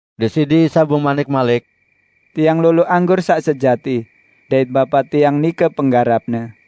Deside Isa bemanik malik, "Tiang lolo anggur saq sejati, dait Bapa Tiang nike penggarapne.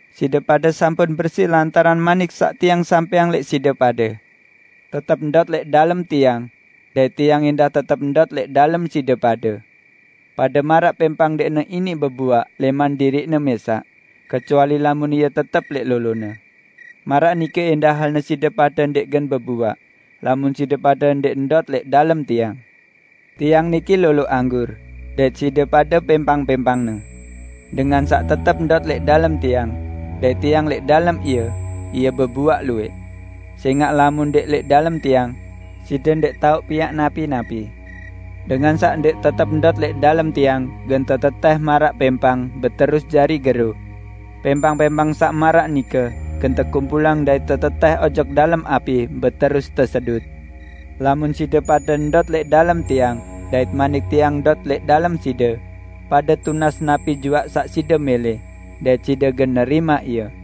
Side pade sampun bersi lantaran manik saq Tiang sampẽang lẽq side pade. Tetep ndot lẽq dalem Tiang dait Tiang ẽndah tetep ndot lẽq dalem side pade. Pade maraq pẽmpang ndẽqne iniq bebuaq lẽman diriqne mẽsaq, kecuali lamun ie tetep lẽq lolone. Maraq nike ẽndah halne side pade ndẽq gen bebuaq, lamun side pade ndẽq ndot lẽq dalem Tiang. Tiang niki lolo anggur, dait side pade pẽmpang-pẽmpangne. Dengan saq tetep ndot lẽq dalem Tiang, dait Tiang lẽq dalem ie, ie bebuaq luwẽq; sẽngaq lamun ndẽq lẽq dalem Tiang, side ndẽq tao piaq napi-napi. Dengan saq ndẽq tetep ndot lẽq dalem Tiang, gen tetetẽh maraq pẽmpang, beterus jari gero. Pẽmpang-pẽmpang saq maraq nike gen tekumpulang dait tetetẽh ojok dalem api, beterus tesedut. Lamun side pade ndot lẽq dalem Tiang dait manik Tiang ndot lẽq dalem side, pade tunas napi juaq saq side mẽlẽ, dait side gen nerimaq ie.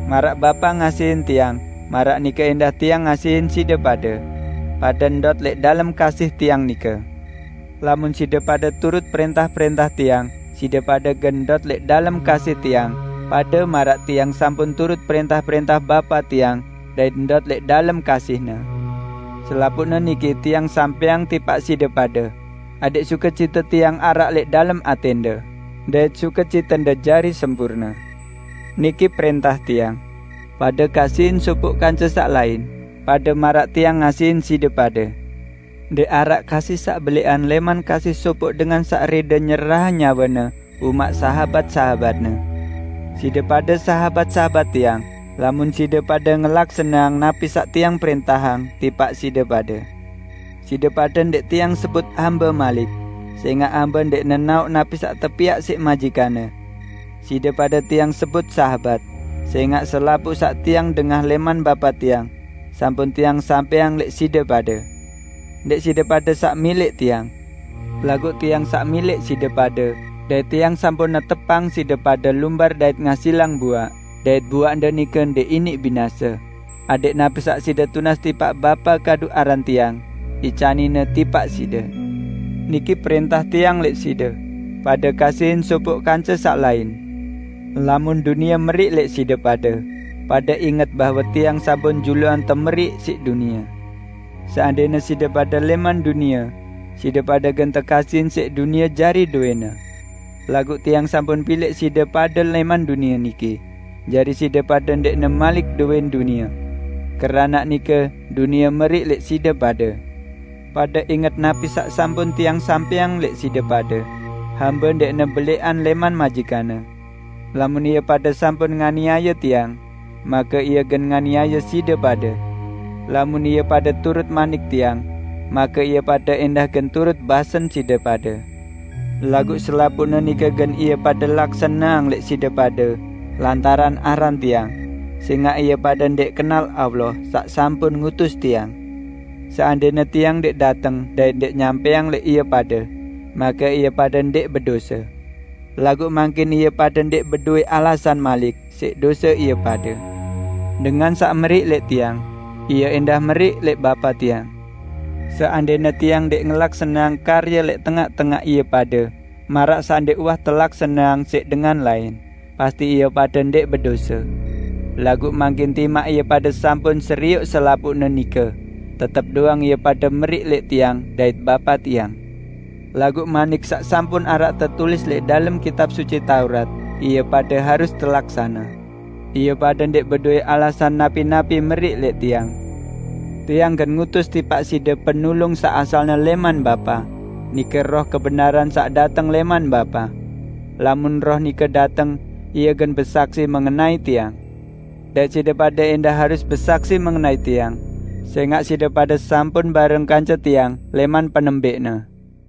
Maraq Bapa ngasihin Tiang, maraq nike ẽndah Tiang ngasihin side pade, pade ndot lẽq dalem kasih Tiang nike. Lamun side pade turut prẽntah-prẽntah Tiang, side pade gen ndot lẽq dalem kasih Tiang, pade maraq Tiang sampun turut prẽntah-prẽntah Bapa Tiang dait ndot lẽq dalem kasih-Ne. Selapuqne niki Tiang sampẽang tipaq side pade, adẽq sukecite Tiang araq lẽq dalem atẽnde, dait sukecitende jari sempurne. Niki prẽntah Tiang: Pade kasihin sopoq kance saq lain, pade maraq Tiang ngasihin side pade. Ndẽq araq kasih saq belẽqan lẽman kasih sopoq dengan saq rẽde nyerahang nyawene umaq sahabat-sahabatne. Side pade sahabat-sahabat Tiang lamun side pade ngelaksaneang napi saq Tiang prẽntahang tipaq side pade. Side pade ndẽq Tiang sebut hambe malik, sẽngaq hambe ndẽq nenaoq napi saq tepiaq siq majikanne. Side pade Tiang sebut sahabat, sẽngaq selapuq saq Tiang dengah lẽman Bapa Tiang, sampun Tiang sampẽang lẽq side pade. Ndẽq side pade saq milẽq Tiang. Laguq Tiang saq milẽq side pade dait Tiang sampun netepang side pade lumbar dait ngasilang buaq dait buaqde nike ndẽq iniq binase, adẽq napi saq side tunas tipaq Bapa kadu aran Tiang, icanin-Ne tipaq side. Niki prẽntah Tiang lẽq side: Pade kasihin sopoq kance saq lain." "Lamun dunie meriq lẽq side pade, pade inget bahwe Tiang sampun juluan temeriq siq dunie. Seandẽne side pade lẽman dunie side pade gen tekasihin siq dunie jari dowẽne. Laguq Tiang sampun pilẽq side pade lẽman dunie niki, jari side pade ndẽqne malik dowẽn dunie. Keranaq nike dunie meriq lẽq side pade. Pade inget napi saq sampun Tiang sampẽang lẽq side pade, 'Hambe ndẽqne belẽqan lẽman majikanne.' Lamun ie pade sampun nganiaye Tiang, make ie gen nganiaye side pade. Lamun ie pade turut manik Tiang, make ie pade ẽndah gen turut basen side pade. Laguq selapuqne nike gen ie pade laksaneang lẽq side pade lantaran aran Tiang, sẽngaq ie pade ndẽq kenal Allah saq sampun ngutus Tiang. Seandẽne Tiang ndẽq dateng dait ndẽq nyampẽang lẽq ie pade, make ie pade ndẽq bedose. Laguq mangkin ie pade ndẽq bedowẽ alasan malik siq dose ie pade. Dengan saq meriq lẽq Tiang, ie ẽndah meriq lẽq Bapa Tiang. Seandẽne Tiang ndẽq ngelaksaneang karye lẽq tengaq-tengaq ie pade maraq saq ndẽq uwah telaksaneang siq dengan lain, pasti ie pade ndẽq bedose. Laguq mangkin timaq ie pade sampun serioq selapuqne nike, tetep doang ie pade meriq lẽq Tiang dait Bapa Tiang. Laguq manik saq sampun araq tetulis lẽq dalem Kitab Suci Taurat ie pade harus telaksane, 'Ie pade ndẽq bedowẽ alasan napi-napi ie meriq lẽq Tiang.' Tiang gen ngutus tipaq side Penulung saq asalne lẽman Bapa, nike Roh Kebenaran saq dateng lẽman Bapa. Lamun Roh nike dateng, Ie gen besaksi mengenai Tiang. Dait side pade ẽndah harus besaksi mengenai Tiang, sẽngaq side pade sampun bareng kance Tiang lẽman penembẽqne.